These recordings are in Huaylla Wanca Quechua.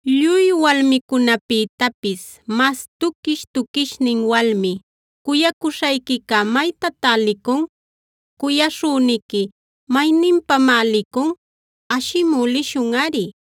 Lluy walmicunäpïtapis mas tuquish-tuquishnin walmi, ¿cuyacuśhayquica maytatá licun? ¿Cuyaśhüniqui mayninpamá licun? Ashimü lishunꞌari.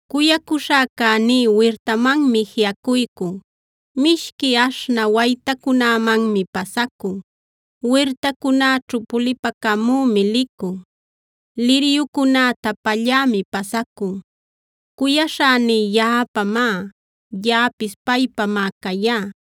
Cuyacuśhäcäní wirtamanmi jiꞌacuycun, mishqui aśhnä waytacunämanmi pasacun, wirtacunäćhu pulipacamümi licun, liryucunäta pallämi pasacun. Cuyaśhäní yaꞌapamá; yaꞌapis paypamá cayá.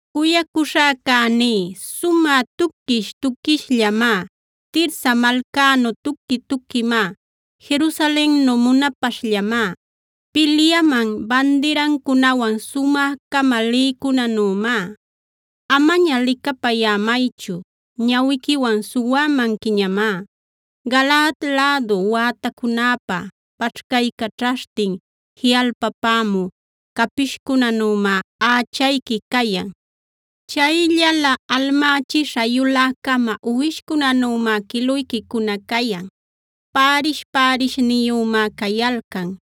Cuyacuśhäcäní sumä tuquish-tuquishllamá; Tirsa malcänu tuqui-tuquimá,b Jerusalennu munapaśhllamá; pilyaman bandirancunawan sumä-cama lïcunänümá. Amaña licapayämaychu; ñawiquiwan suwämanquiñamá. Galaad lädu wätacunäpa paćhcaycaćhaśhtin jiꞌalpapämü capishcunänümá ächayqui cayan. Chayllala almächisha yulä-cama uwishcunanümá quiluyquicuna cayan. Pärish-pärishniyümá cayalcan;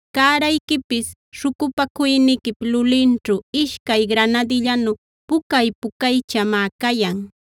Cärayquipis śhucupacuyniquip lulinćhu ishcay granadillanu pucay-pucaychamá cayan.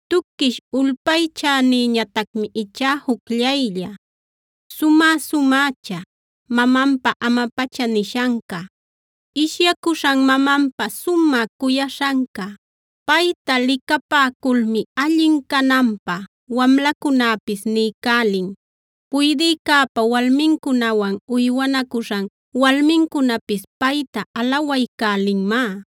Tuquish ulpaychänïñatacmi ichá jucllaylla, sumä-sumächa, mamanpa ama-pacha nishanca, ishyacuśhan mamanpa sumä cuyaśhanca. Payta licapäculmi allin cananpä wamlacunäpis niycälin; puydïcäpa walmincunawan uywanacuśhan walmincunapis payta alawaycälinmá.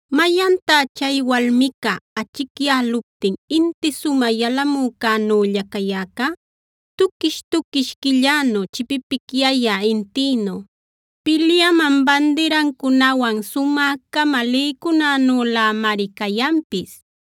¿Mayantá chay walmica achicyäluptin inti sumä yalamücänülä cayäca? Tuquish-tuquish quillänu, chipipicyayä intïnu, pilyaman bandirancunawan sumä-cama lïcunänülämari cayanpis.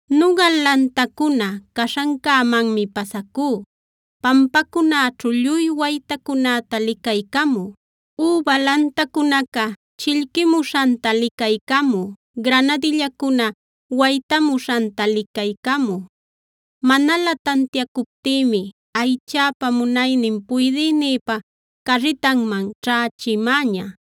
Nugal lantancuna caśhancämanmi pasacú, pampacunäćhu lluy waytacunäta licaycamü, üba lantacunaca chillquimuśhanta licaycamü, granadillacuna waytamuśhanta licaycamü. Manalä tantiacuptïmi aychäpa munaynin puydïnïpa carritanman ćhächimäña.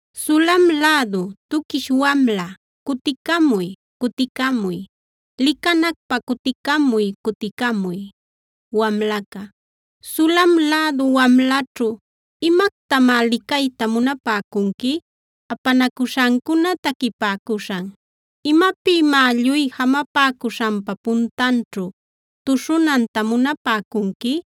¡Sulam lädu tuquish wamla, cuticamuy, cuticamuy! ¡Licanacpä cuticamuy, cuticamuy! Wamlaca Sulam lädu wamlaćhu, ¿imactamá licayta munapäcunqui? Apanacuśhancuna taquipäcuśhan ¿Imapïmá lluy jamapäcuśhanpa puntanćhu tuśhunanta munapäcunqui?